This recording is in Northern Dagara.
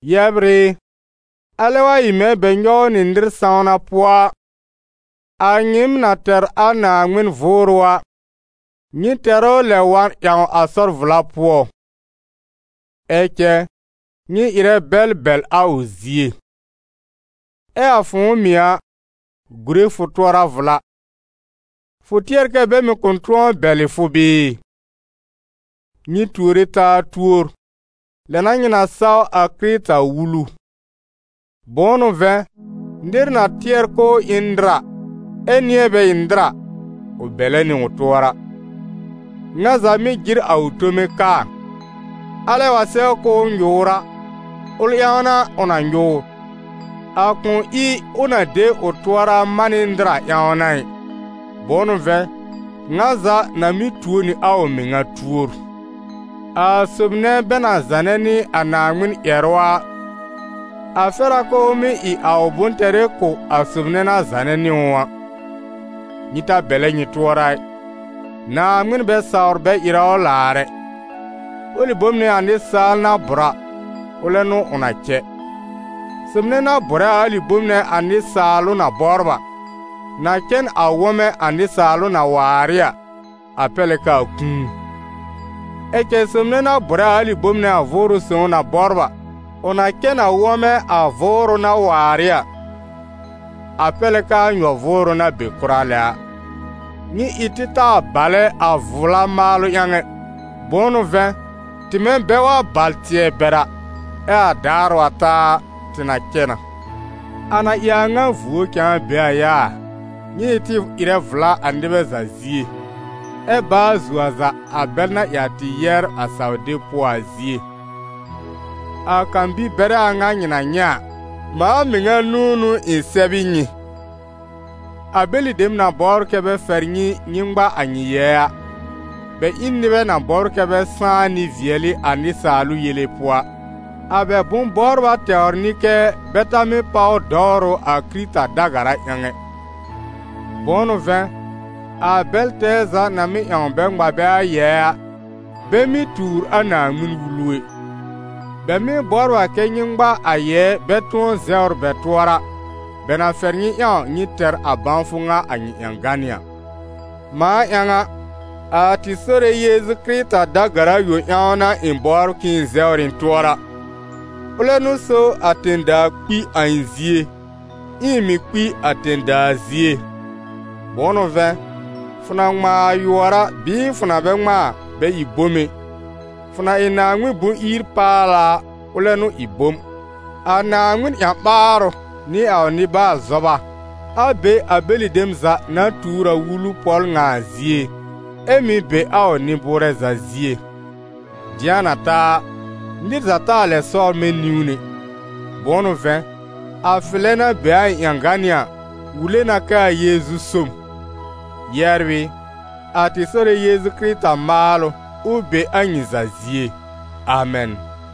Yɛbr ɩ, alɛ wa ɩ mɛ̃ bɛ nyɔw nɩ nɩr sãwna pʋɔ a, a nyɩɩm na tɛr a Naaŋmɩn Vʋʋrʋ a, nyɩ tɛr ʋ lɛb wa ƴãw a sɔr vla pʋɔ; ɛ cɛ nyɩ ɩrɛ bɛl bɛl a ʋ zie. Ɛ a fʋ̃ʋ mɩ̀ a, gurè fʋ tʋɔra vla: fʋ tɩɛr kɛ bɛ mɩ̀ kʋ̃ tʋ̃ɔ bɛlɩ fʋ bɩɩ? Nyɩ tuore taa tuor, lɛ n'a nyɩ na saw a Kɩrɩta Wulu. Bʋ̃ʋ n'ʋ vɛ̃, nɩr na tɩɛr k'ʋʋ ɩ n nɩr, ɛ nɩ̃ɛ bɛ ɩ nɩr a, ʋ bɛlɛ nɩ ʋ tʋɔra. Ŋa za mɩ́ jɩr a ʋ tome kaa, alɛ wa sɛw k'ʋʋ nyʋʋr a, ʋl ƴãw n'a ʋ na nyʋʋr, a kʋ̃ ɩ ʋ na de ʋ tʋɔra man nɩ nɩr a ƴãw n'a ɩ. Bʋ̃ʋ n'ʋ vɛ̃, ŋa za na mɩ́ tuo nɩ a ʋ mɩŋa tuor. A sob nɛ bɛ na zanɛ nɩ a Naaŋmɩn ƴɛrʋ a, a fɛr a k'ʋʋ mɩ́ ɩ a ʋ bʋ̃-tɛrɩ kʋ̀ a sob nɛ na zanɛ nɩ ʋ a. Nyɩ ta bɛlɛ nyɩ tʋɔra ɩ: Naaŋmɩn bɛ sawr bɛ ɩrɛ ʋ laar ɛ. Ʋlɩ bom nɛ a nɩsaal na bʋ̀r a, ʋlɛ n'ʋ ʋ na cɛ. Sob nɛ na bʋ̀rɛ a alɩ bome nɛ a nɩsaalʋ na bɔbr a, na cɛ n a wɔ̃mɛ a nɩsaalʋ na waar ɩ a, a pɛr lɛ k'aa kũu. Ɛ cɛ sob nɛ na bʋ̀rɛ a alɩ bome nɛ a Vʋʋrʋ Sõw na bɔbr a, ʋ na cɛ n a wɔ̃mɛ a Vʋʋrʋ na waar ɩ a, a pɛr lɛ k'aa nyɔ-vʋʋrʋ na be kʋra lɛ a. Nyɩ ɩ tɩ taa balɛ a vla maalʋ ƴãw ɛ; bʋ̃ʋ n'ʋ vɛ̃, tɩmɛ bɛ wa bal tɩɛ bɛr a, ɛ a daar wa ta a, tɩ na cɛ na. A na ɩ a ŋa vuo cãa be a yaa, nyɩ ɩ tɩ ɩrɛ vla a nɩbɛ za zie, ɛ baa zuo a za a bɛl na ɩ a tɩ yɛbr a saw-deb pʋɔ a zie. A kan-bi-bɛrɛ a ŋa nyɩ na nyɛ̃ a, mãa mɩŋa nũu n'ʋ ɩ̃ sɛb ɩ nyɩ. A bɛlɩ dem na bɔbr kɛ́ bɛ fɛr nyɩ nyɩ ŋma a nyɩ yɛɛ a, bɛ ɩ n nɩbɛ na bɔbr kɛ́ bɛ sãá nɩ-vɩɛlɩ a nɩsaalʋ yele pʋɔ a. A bɛ bʋ̃-bɔbra tɛwr n'ɩ kɛ́ bɛ ta mɩ́ páw dɔwrʋ a Kɩrɩta da-gara ƴãw ɛ. Bʋ̃ʋ n'ʋ vɛ̃, a bɛl tɛɛ za na mɩ́ ƴãw bɛ ŋma bɛ a yɛɛ a, bɛ mɩ́ tuur a Naaŋmɩn-Wulu ɛ; bɛ mɩ́ bɔbr a kɛ́ nyɩ ŋma a yɛɛ bɛ tʋ̃ɔ zɛwr bɛ tʋɔra, bɛ na fɛr nyɩ ƴãw nyɩ tɛr a bãwfʋ ŋa a nyɩ ƴãgánɩ́ a. Mãa ƴãw a, a tɩ Sore Yeezu Kɩrɩta da-gara yõ ƴãw n'a ɩ̃ bɔbr k'ɩ̃ɩ zɛwr ɩ̃ tʋɔra. Ʋlɛ n'ʋ so a tẽ-daa kpi a ɩ̃ zie, ɛ ɩ̃ mɩ̀ kpi a tẽ-daa zie. Bʋ̃ʋ n'ʋ vɛ̃, fʋ na ŋmãa a yʋɔr bɩɩ fʋ na bɛ ŋmãa a, bɛ ɩ bom ɛ, fʋ na ɩ Naaŋmɩn bʋ̃-ir-paala a, ʋlɛ n'ʋ ɩ bom. A Naaŋmɩn ƴã-ɓaarʋ nɩ a ʋ nɩ-baal-zɔba, a be a bɛlɩ dem za na tuur a wulu pɔl ŋa a zie, ɛ mɩ̀ be a ʋ nɩ-bʋurɛ za zie. Dɩ̃a na ta a, nɩr za taa lɛ sɔbr mɛ̃ niwn ɛ; bʋ̃ʋ n'ʋ vɛ̃, a fɩlɛ na be a ɩ̃ ƴãgánɩ́ a wule na k'aa Yeezu so m. Yɛbr ɩ, a tɩ Sore Yeezu Kɩrɩta maalʋ, ʋ be a nyɩ za zie. Amɛn.